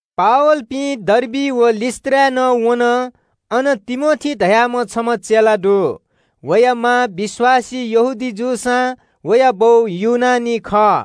पावलपिं हानं डर्बी जुयाः लुस्‍त्राय् वन। अन तिमोथी धाःम्‍ह छम्‍ह चेला दु। वया मां विश्‍वासी यहूदी जूसां वया बौ ग्रीक खः।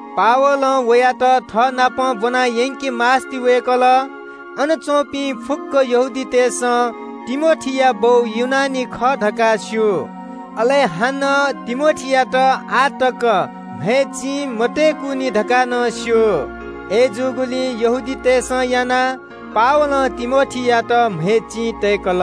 पावलं वयात थःनाप ब्‍वनायंके मास्‍ति वय्‌कल। अन च्‍वंपिं फुक्‍क यहूदीतय्‌सं तिमोथीया बौ ग्रीक खः धकाः स्‍यू, अले हानं तिमोथीयात आः तक म्‍हय् चिं मतय्‌कुनि धकाः नं स्‍यू। अय्‌जूगुलिं यहूदीतय् नायःतय्‌सं यानाः पावलं तिमोथीयात म्‍हय् चिं तय्‌कल।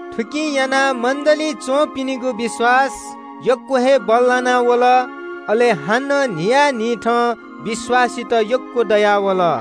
थुकिं यानाः मण्‍डलीइ च्‍वंपिनिगु विश्‍वास यक्‍व हे बल्‍लाना वल। अले हानं न्‍हियान्‍हिथं विश्‍वासीत यक्‍व दयावल।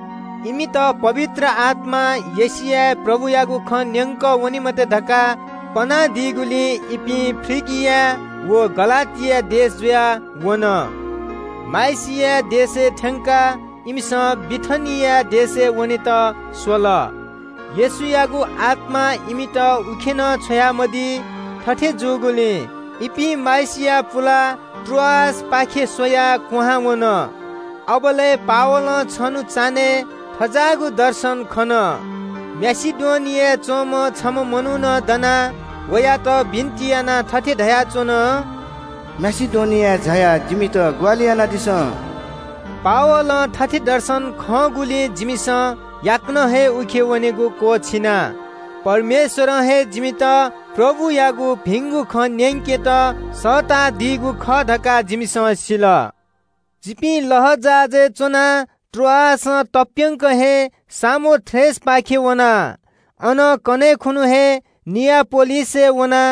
इमित पवित्र आत्‍मां एशियाय् प्रभुयागु खँ न्‍यंक वने मते धकाः पनादीगुलिं इपिं फ्रिगिया व गलातिया देश जुयाः वन। माइसिया देशय् थ्‍यंकाः इमिसं बिथिनिया देशय् वनेत स्‍वल। येशूयागु आत्‍मां इमित उखे नं छ्वयामदी। थथे जूगुलिं इपिं माइसिया पुलाः त्रोआसपाखे स्‍वयाः क्‍वहां वन। अबलय् पावलं छन्‍हु चान्‍हय् थज्‍याःगु दर्शन खन। माकेडोनियाय् च्‍वंम्‍ह छम्‍ह मनुखं दनाः वयात बिन्‍ति यानाः थथे धयाच्‍वन – “माकेडोनियाय् झायाः जिमित ग्‍वाहालि यानादिसँ।” पावलं थथे दर्शन खंगुलिं जिमिसं याकनं हे उखे वनेगु क्‍वःछिना। परमेश्‍वरं हे जिमित प्रभुयागु भिंगु खँ इमित न्‍यंकेत सःतादीगु खः धकाः जिमिसं सिल। जिपिं लःजहाजय् च्‍वनाः त्रोआसं तप्‍यंक हे सामोथ्राकेपाखे वना। अनं कन्‍हय् खुन्‍हु हे नियापोलिसय् वना।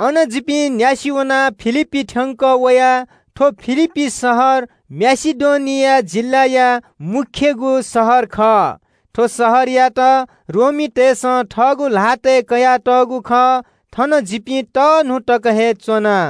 अनं जिपिं न्‍यासि वनाः फिलिप्‍पीइ थ्‍यंकः वया। थ्‍व फिलिप्‍पी शहर माकेडोनिया जिल्‍लाया मू शहर खः। थ्‍व शहरयात रोमीतय्‌सं थःगु ल्‍हातय् कयातःगु खः। थन जिपिं छुं न्‍हि तक हे च्‍वना।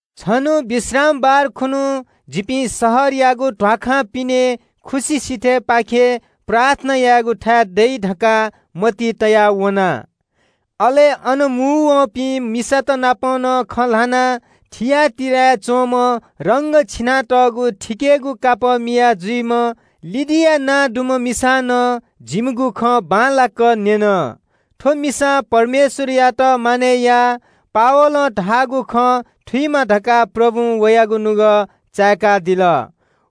छन्‍हु विश्रामबार खुन्‍हु जिपिं शहरयागु ध्‍वाखां पिने खुसि सिथय् पाखे प्रार्थना यायेगुथाय् दइ धकाः मतिइ तयाः वना। अले अन मुंवःपिं मिसात नाप नं खँ ल्‍हाना। थिआटीराय् च्‍वंम्‍ह रंग छिनातःगु थिकेगु कापः मिया जुइम्‍ह लिडिया नां दुम्‍ह मिसां नं जिमिगु खँ बांलाक न्‍यन। थ्‍व मिसां परमेश्‍वरयात मानय् याः। पावलं धाःगु खँ थुइमा धकाः प्रभुं वयागु नुगः चाय्‌कादिल।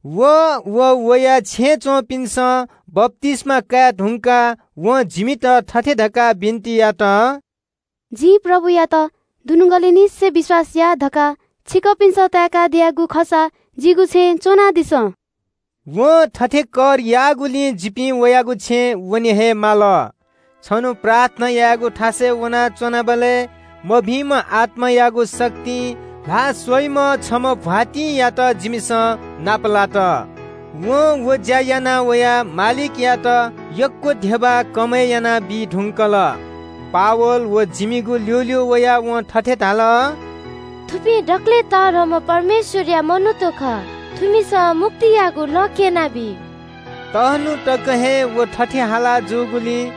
अले व वया छेँय् च्‍वंपिन्‍सं बप्‍तिस्‍मा काये धुंकाः वं जिमित थथे धकाः बिन्‍ति यात – “जिं प्रभुयात दुनुगलंनिसें विश्‍वास याः धकाः छिकपिन्‍सं ताय्‌कादियागु खःसा जिगु छेँय् च्‍वं झासँ।” वं थथे कर याःगुलिं जिपिं वयागु छेँय् वना। छन्‍हु प्रार्थना यायेगु थासय् वनाच्‍वनाबलय् मभिंम्‍ह आत्‍मायागु शक्तिं ल्‍हाः स्‍वइम्‍ह छम्‍ह दासीयात जिमिसं नापलात। वं व ज्‍या यानाः वया मालिकयात यक्‍व धिबा कमय् यानाबी धुंकल। पावल व जिमिगु ल्‍यूल्‍यू वयाः वं थथे धाल – “थुपिं दकलय् तःधंम्‍ह परमेश्‍वरया मनूत खः। थुमिसं मुक्तियागु लँ क्‍यनाबी।” तःन्‍हु तक हे व थथे हाला जूगुलिं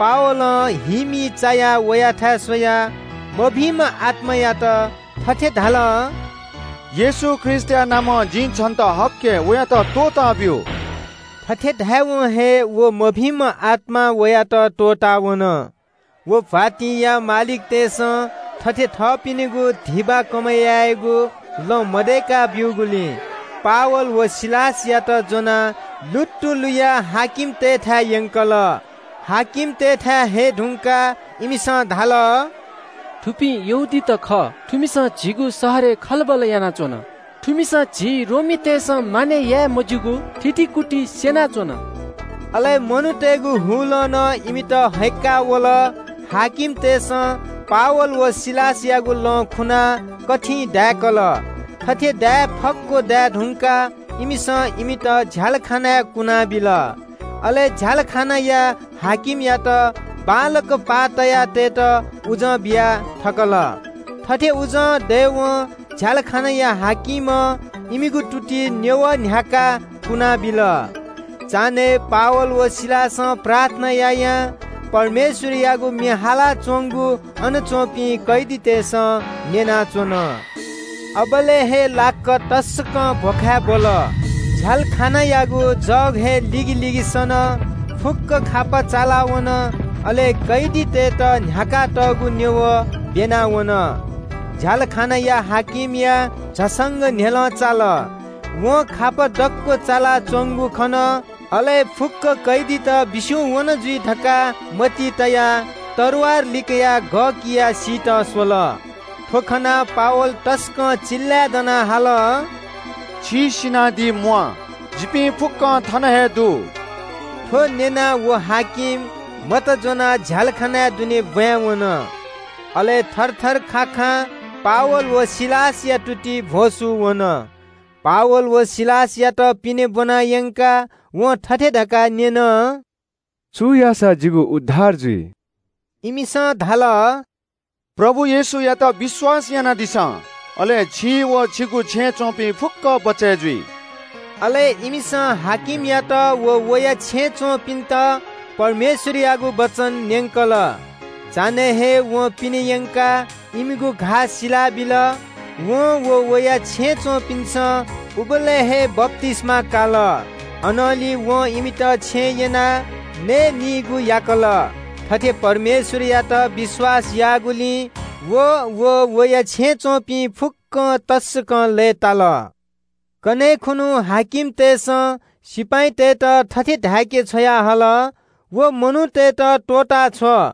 पावलं हीमी चायाः वयाथाय् स्‍वयाः मभिंम्‍ह आत्‍मायात थथे धाल – “येशू ख्रीष्‍टया नामं जिं छन्‍त हक्‍के, वयात त्‍वःताब्‍यु।” थथे धायेवं हे व मभिंम्‍ह आत्‍मां वयात त्‍वःतावन। व दासीया मालिकतय्‌सं थथे थःपिनिगु धिबा कमय् यायेगु लँ मदय्‌का ब्‍यूगुलिं पावल व सिलासयात ज्‍वनाः लुत्तु लुयाः हाकिमतय्‌थाय् यंकल। अन हये धुंकाः इमिसं धाल – “थुपिं यहूदीत खः। थुमिसं झीगु शहरय् खलबल यानाच्‍वन। थुमिसं झी रोमीतय्‌सं मानय् याये मज्‍यूगु थितिकुति स्‍यनाच्‍वन।” अले मनूतय्‌गु हुलं नं इमित हय्‌क्‍का वल। हाकिमतय्‌सं पावल व सिलासयात लं त्‍वःकाः दायेत आज्ञा बिल। थथे दाये फक्‍व दाये धुंकाः इमित झ्‍यालखानाय् कुनाबिल। अले झ्‍यालखानाया हाकिमयात बांलाक पाः तया तयेत उजं बिया थकल। थथे उजं दयेवं झ्‍यालखानाया हाकिमं इमिगु तुतिइ न्‍यवः न्‍ह्याकाः कुनाबिल। चान्‍हय् पावल व सिलासं प्रार्थना यायां परमेश्‍वरयागु म्‍ये हालाच्‍वंगु अन च्‍वंपिं कैदीतय्‌सं न्‍यनाच्‍वन। अबलय् हे लाक्‍क तसकं भ्‍वखाय् ब्‍वल। झ्‍यालखानायागु जग हे लिगिलिगि सन। फुक्‍क खापा चालावन, अले कैदीतय्‌त न्‍ह्याकातःगु न्‍यवः ब्‍यना वन। झ्‍यालखानाया हाकिमया झसंक न्‍ह्यलं चाल। वं खापा दक्‍व चालाच्‍वंगु खन। अले “फुक्‍क कैदीत बिस्‍युं वन जुइ” धकाः मतिइ तयाः तरवार लिकयाः गः कियाः सीत स्‍वल। थ्‍व खनाः पावल तसकं चिल्‍लाय् दनाः हाल – “अथे यानादी मते, जिपिं फुक्‍कं थन हे दु।” थ्‍व न्‍यनाः व हाकिम मत ज्‍वनाः झ्‍यालखानाय् दुने ब्‍वाँय् वन। अले थरथर खाखां पावल व सिलासया तुतिइ भ्‍वसू वन। पावल व सिलासयात पिने ब्‍वना यंकाः वं थथे धकाः न्‍यन – “छु याःसा जिगु उद्धार जुइ?” इमिसं धाल – “प्रभु येशूयात विश्‍वास यानादिसँ, अले छि व छिगु छेँय् च्‍वंपिं फुक्‍कं बचय् जुइ।” अले इमिसं हाकिमयात व वया छेँय् च्‍वंपिन्‍त परमेश्‍वरयागु वचन न्‍यंकल। चान्‍हय् हे वं पिने यंकाः इमिगु घाः सिला बिल। वं व वया छेँय् च्‍वंपिन्‍सं उबलय् हे बप्‍तिस्‍मा काल। अनंलि वं इमित छेँय् यनाः नके त्‍वंकेगु यात। थथे परमेश्‍वरयात विश्‍वास याःगुलिं व अले वया छेँय् च्‍वंपिं फुक्‍कं तसकं लय्‌ताल। कन्‍हय् खुन्‍हु हाकिमतय्‌सं सिपाइँतय्‌त थथे धाय्‌के छ्वयाहल – “व मनूतय्‌त त्‍वःताछ्व।”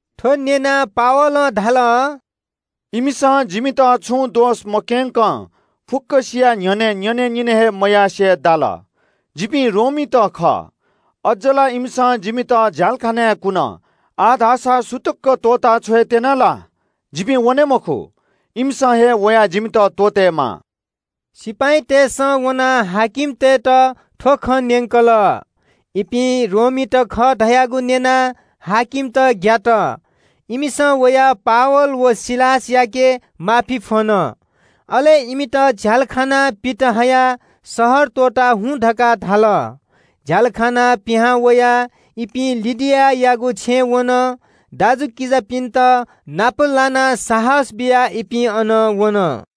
थ्‍व न्‍यनाः पावलं धाल – “इमिसं जिमित छुं दोष मक्‍यंकं फुक्‍कसिया न्‍ह्यःने न्‍यनेनिने हे मयासें दाल। जिपिं रोमीत खः। अज्‍ज ला इमिसं जिमित झ्‍यालखानाय् कुन। आः धाःसा सुतुक्‍क त्‍वःता छ्वयेत्‍यन ला? जिपिं वने मखु। इमिसं हे वयाः जिमित त्‍वःतेमाः।” सिपाइँतय्‌सं वनाः हाकिमतय्‌त थ्‍व खँ न्‍यंकल। इपिं रोमीत खः धयागु न्‍यनाः हाकिमत ग्‍यात। इमिसं वयाः पावल व सिलासयाके माफी फ्‍वन। अले इमित झ्‍यालखानां पित हयाः शहर त्‍वःता झासँ धकाः धाल। झ्‍यालखानां पिहां वयाः इपिं लिडियायागु छेँय् वन। दाजुकिजापिन्‍त नाप लानाः साहस बियाः इपिं अनं वन।